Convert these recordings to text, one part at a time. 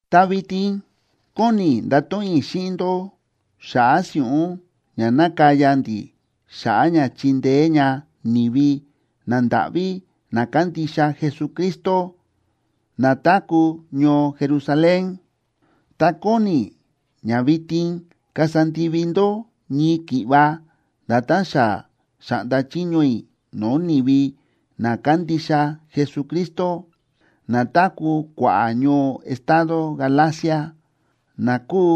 Ta vitin kóni i̱ ndato̱ꞌon i̱ xíꞌin ndó xa̱ꞌa̱ si̱ꞌún ña nákaya ndi̱ xa̱ꞌa̱ ña chindeé ña ni̱vi nandáꞌví na kándixa Jesucristo, na táku̱ ñoo Jerusalén. Ta kóni i̱ ña vitin kasa ndivi ndó ñii ki̱ꞌva nda̱tán xa xa̱ꞌnda chiño i̱ no̱o̱ ni̱vi na kándixa Jesucristo, na táku̱ kua̱ꞌa̱ ñoo estado Galacia, na kúu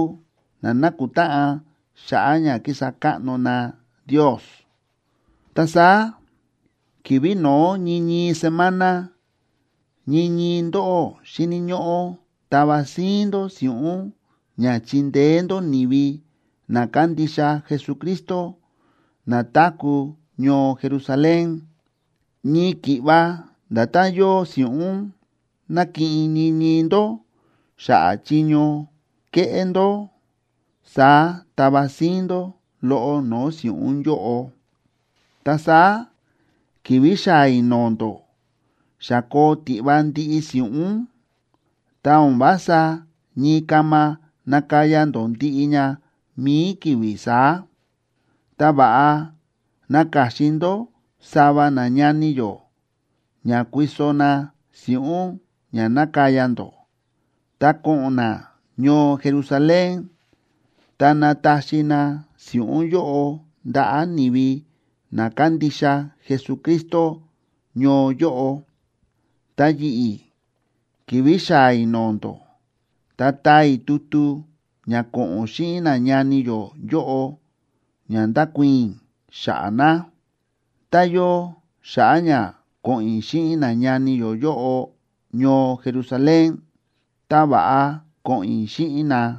na nákutáꞌan xa̱ꞌa̱ ña kísa káꞌno na Ndios. Ta saá ki̱vi̱ no̱ó ñii ñii semana, ñii ñii ndóꞌó xíni̱ ñóꞌó tava síín ndó si̱ꞌún ña chindeé ndó ni̱vi na kándixa Jesucristo na táku̱ ñoo Jerusalén. Ñii ki̱ꞌva nda̱tán yóo si̱ꞌún nákiꞌin ñii ñii ndó xa̱ꞌa̱ chiño kéꞌé ndó, saá tava síín ndó loꞌo no̱o̱ si̱ꞌún yóꞌo. Ta saá ki̱vi̱ xaa̱ i̱ no̱o̱ ndó, xa koo tiꞌva ndiꞌi si̱ꞌún, ta o̱n vása ñii kama nakaya ndó ndiꞌi ña mi̱i ki̱vi̱ saá. Ta va̱ꞌa naka̱xin ndó sava nañani yó, ña kuiso na si̱ꞌún ña nakaya ndó, ta ko̱ꞌo̱n na ñoo Jerusalén, ta nataxi na si̱ꞌún yóꞌo ndaꞌa̱ ni̱vi na kándixa Jesucristo ñoo yóꞌo. Ta yi̱ꞌi̱, ki̱vi̱ xaa̱ i̱ no̱o̱ ndó, ta taa i̱ tutu ña ko̱ꞌo̱n xíꞌin nañani yó yóꞌo ña ndakuii̱n i̱ xa̱ꞌa̱ na. Tá yóo xa̱ꞌa̱ ña ko̱ꞌo̱n i̱ xíꞌin nañani yó yóꞌo ñoo Jerusalén, ta va̱ꞌa ko̱ꞌo̱n i̱ xíꞌin na.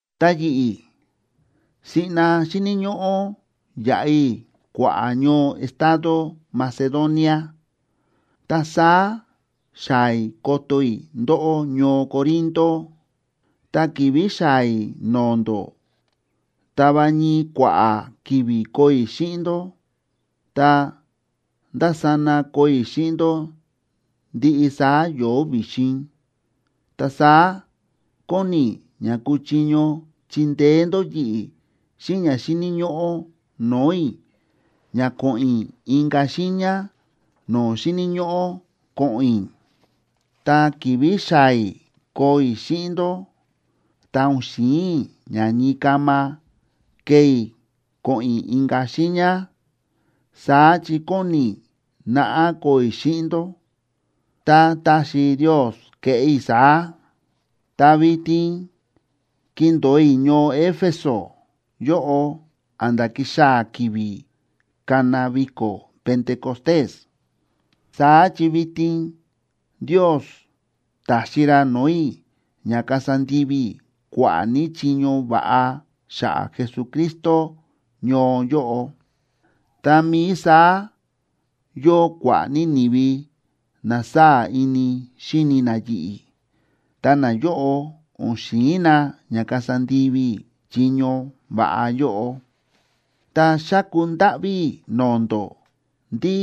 Ta yi̱ꞌi̱, siꞌna xíni̱ ñóꞌó yaꞌa i̱ kua̱ꞌa̱ ñoo estado Macedonia, ta saá xaa̱ i̱ koto i̱ ndóꞌó ñoo Corinto. Ta ki̱vi̱ xaa̱ i̱ no̱o̱ ndó, ta va ñii kua̱ꞌa̱ ki̱vi̱ koo i̱ xíꞌin ndó, ta ndásana koo i̱ xíꞌin ndó ndiꞌi saá yo̱o̱ vi̱xin. Ta saá kóni i̱ ña kuchiño chindeé ndó yi̱ꞌi̱ xíꞌin ña xíni̱ ñóꞌó no̱o̱ i̱ ña ko̱ꞌo̱n i̱ inka̱ xiiña no̱o̱ xíni̱ ñóꞌó ko̱ꞌo̱n i̱. Ta ki̱vi̱ xaa̱ i̱ koo i̱ xíꞌin ndó, ta o̱n xi̱in i̱ ña ñii kama kee i̱ ko̱ꞌo̱n i̱ inka̱ xiiña. Saá chi kóni i̱ naꞌá koo i̱ xíꞌin ndó, tá taxi Ndios keꞌé i̱ saá. Ta vitin kindo̱o i̱ ñoo Éfeso yóꞌo a̱nda̱ kixaa̱ ki̱vi̱ kana viko̱ Pentecostés. Saá chi vitin Ndios ta̱xi ra no̱o̱ i̱ ña kasa ndivi i̱ kua̱ꞌa̱ ní chiño va̱ꞌa xa̱ꞌa̱ Jesucristo ñoo yóꞌo. Tá mií saá yóo kua̱ꞌa̱ ní ni̱vi na sáa̱ ini xíni na yi̱ꞌi̱, ta nayóꞌo o̱n xi̱in na ña kasa ndivi i̱ chiño va̱ꞌa yóꞌo. Ta xáku ndáꞌví i̱ no̱o̱ ndó ndí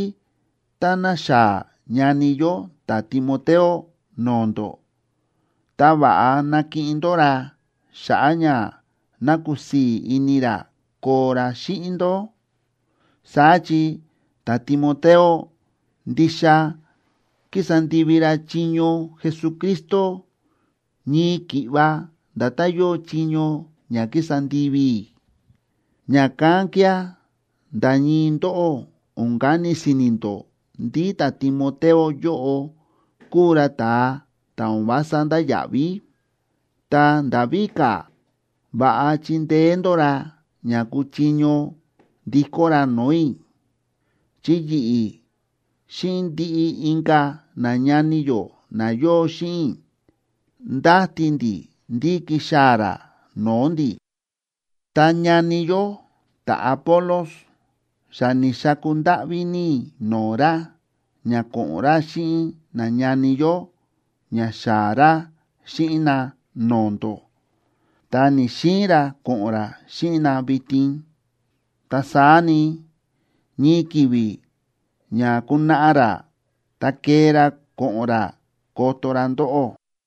táná xaa̱ ñani yó ta̱Timoteo no̱o̱ ndó, ta va̱ꞌa nakiꞌin ndó ra xa̱ꞌa̱ ña ná kusii̱ ini ra koo ra xíꞌin ndó. Saá chi ta̱Timoteo ndixa kísa ndivi ra chiño Jesucristo ñii ki̱ꞌva nda̱tán yóo chiño ña kísa ndivi i̱. Ña̱kán kía̱ nda̱ ñii ndóꞌó o̱n kani si̱ni̱ ndó ndí ta̱Timoteo yóꞌo kúu ra ta̱a ta̱ o̱n vása ndáya̱ꞌví. Ta nda̱ víka̱, va̱ꞌa chindeé ndó ra ña kuchiño ndikó ra no̱o̱ i̱, chi yi̱ꞌi̱ xíꞌin ndiꞌi inka̱ nañani yó na yóo xíꞌin i̱ ndáti ndi̱ ndí kixaa̱ ra no̱o̱ ndi̱. Ta ñani yó ta̱Apolos, xa ni̱xaku ndáꞌví ní i̱ no̱o̱ ra ña ko̱ꞌo̱n ra xíꞌin nañani yó ña xaa̱ ra xíꞌin na no̱o̱ ndó, ta ni̱‑xiin ra ko̱ꞌo̱n ra xíꞌin na vitin. Ta saá ni, ñii ki̱vi̱ ña kunaꞌa ra, ta kee ra ko̱ꞌo̱n ra koto ra ndóꞌó.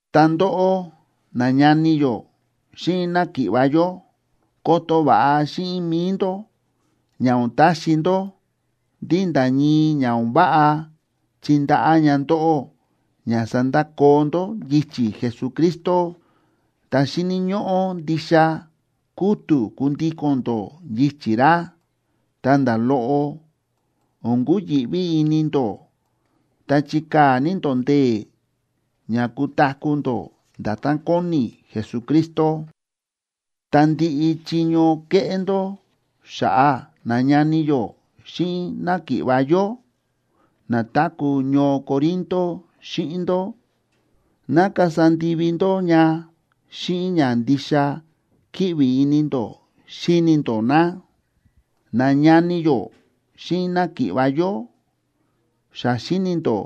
Ta ndóꞌó, nañani yó xíꞌin náki̱ꞌva̱ yó, koto va̱ꞌa xíꞌin mi̱i ndó ña o̱n taxi ndó ndí nda̱ ñii ña o̱n váꞌa chindaꞌá ña ndóꞌó ña sandakoo ndó yichi̱ Jesucristo. Ta xíni̱ ñóꞌó ndixa kútu̱ kundíko̱n ndó yichi̱ ra, ta nda̱ loꞌo o̱n kuyi̱ꞌví ini ndó, ta chikaa̱ ní ndó ndee̱ ña kutaku̱ ndó nda̱tán kóni Jesucristo. Ta ndiꞌi chiño kéꞌé ndó xa̱ꞌa̱ nañani yó xíꞌin náki̱ꞌva̱ yó na táku̱ ñoo Corinto xíꞌin ndó, ná kasa ndivi ndó ña xíꞌin ña ndixa kíꞌvi ini ndó xíni ndó na. Nañani yó xíꞌin náki̱ꞌva̱ yó, xa xíni̱ ndó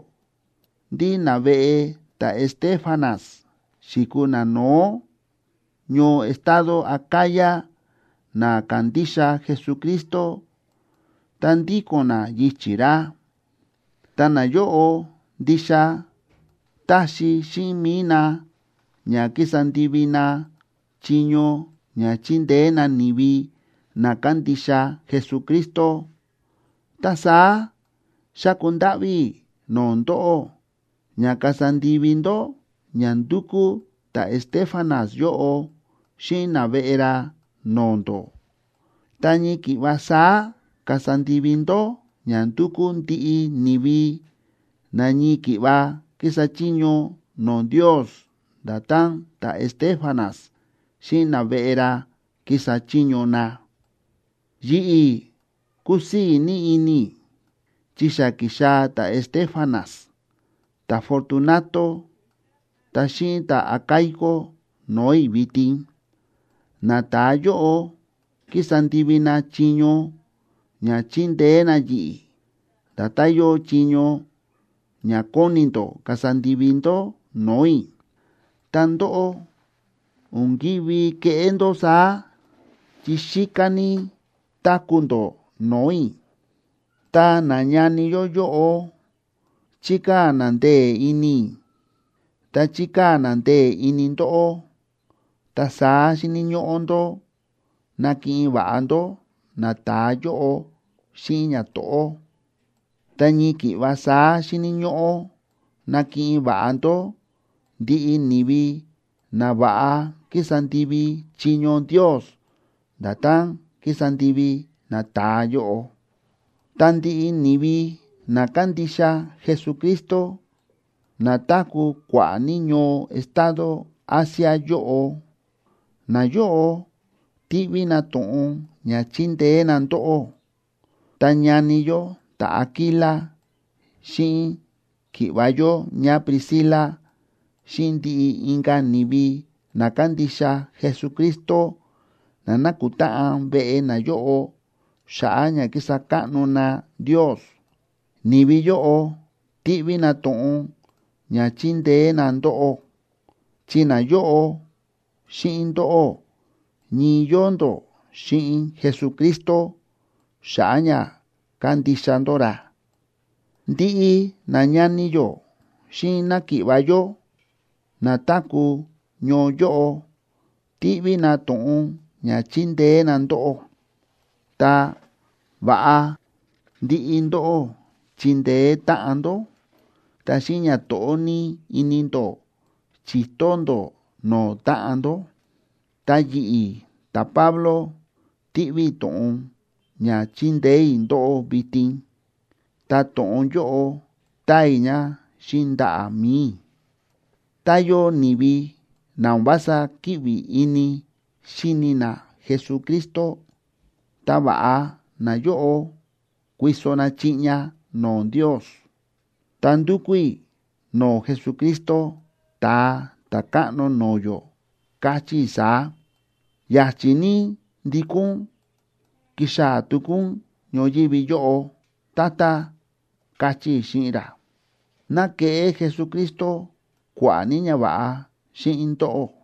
ndí naveꞌe ta̱Estéfanas xi̱kuu nano̱ó ñoo estado Acaya na ka̱ndixa Jesucristo ta ndíko̱n na yichi̱ ra. Ta nayóꞌo ndixa táxi xíꞌin mi̱i na ña kísa ndivi na chiño ña chindeé na ni̱vi na kándixa Jesucristo. Ta saá xáku ndáꞌví i̱ no̱o̱ ndóꞌó ña kasa ndivi ndó ña ndúkú ta̱Estéfanas yóꞌo xíꞌin naveꞌe ra no̱o̱ ndó. Ta ñii ki̱ꞌva saá kasa ndivi ndó ña ndúkú ndiꞌi ni̱vi na ñii ki̱ꞌva kísa chiño no̱o̱ Ndios nda̱tán ta̱Estéfanas xíꞌin naveꞌe ra kísa chiño na. Yi̱ꞌi̱ kúsii̱ ní ini i̱, chi xa ki̱xaa̱ ta̱Estéfanas, ta̱Fortunato ta xíꞌin ta̱Acaico no̱o̱ i̱ vitin. Nata̱a yóꞌo kísa ndivi na chiño ña chíndeé na yi̱ꞌi̱, nda̱tán yóo chiño ña kóni ndó kasa ndivi ndó no̱o̱ i̱. Ta ndóꞌó o̱n ki̱ví keꞌé ndó saá chi xíká ní táku̱ ndó no̱o̱ i̱. Ta nañani yó yóꞌo chi̱kaa̱ na ndee̱ ini i̱, ta chi̱kaa̱ na ndee̱ ini ndóꞌó. Ta saá xíni̱ ñóꞌó ndó nakiꞌin va̱ꞌa ndó nata̱a yóꞌo xíꞌin ñato̱ꞌó, ta ñii ki̱ꞌva saá xíni̱ ñóꞌó nakiꞌin va̱ꞌa ndó ndiꞌi ni̱vi na va̱ꞌa kísa ndivi chiño Ndios nda̱tán kísa ndivi nata̱a yóꞌo. Ta ndiꞌi ni̱vi na kándixa Jesucristo, na táku̱ kua̱ꞌa̱ ní ñoo estado Asia yóꞌo, nayóꞌo tíꞌví na to̱ꞌon ña chindeé na ndóꞌó. Ta ñani yó ta̱Aquila xíꞌin ki̱ꞌva̱ yó ñáPriscila xíꞌin ndiꞌi inka̱ ni̱vi na kándixa Jesucristo na nákutáꞌan veꞌe nayóꞌo xa̱ꞌa̱ ña kísa káꞌno na Ndios, ni̱vi yóꞌo tíꞌví na to̱ꞌon ña chindeé na ndóꞌó, chi nayóꞌo xíꞌin ndóꞌó ñii yóo ndó xíꞌin Jesucristo xa̱ꞌa̱ ña kándixa ndó ra. Ndiꞌi nañani yó xíꞌin náki̱ꞌva̱ yó na táku̱ ñoo yóꞌo tíꞌví na to̱ꞌon ña chindeé na ndóꞌó. Ta va̱ꞌa ndiꞌi ndóꞌó chindeé táꞌan ndó, ta xíꞌin ñato̱ꞌó ní ini ndó chi̱to ndó no̱o̱ táꞌan ndó. Ta yi̱ꞌi̱, ta̱Pablo, tíꞌví i̱ to̱ꞌon ña chindeé i̱ ndóꞌó vitin. Ta to̱ꞌon yóꞌo táa i̱ ña xíꞌin ndaꞌa̱ mi̱i i̱. Tá yóo ni̱vi na o̱n vása kíꞌvi ini xíni na Jesucristo, ta, ¡va̱ꞌa nayóꞌo kuiso na chiꞌña no̱o̱ Ndios! Ta ndúkú i̱ no̱o̱ Jesucristo, Ta̱a Ta̱káꞌno no̱o̱ yó, káchí i̱ saá: “¡Ya̱chi̱ ní ndikó ún kixaa̱ tuku ún ñoyívi yóꞌo, Tata!”, káchí i̱ xíꞌin ra. ¡Ná keꞌé Jesucristo kua̱ꞌa̱ ní ñava̱ꞌa xíꞌin ndóꞌó!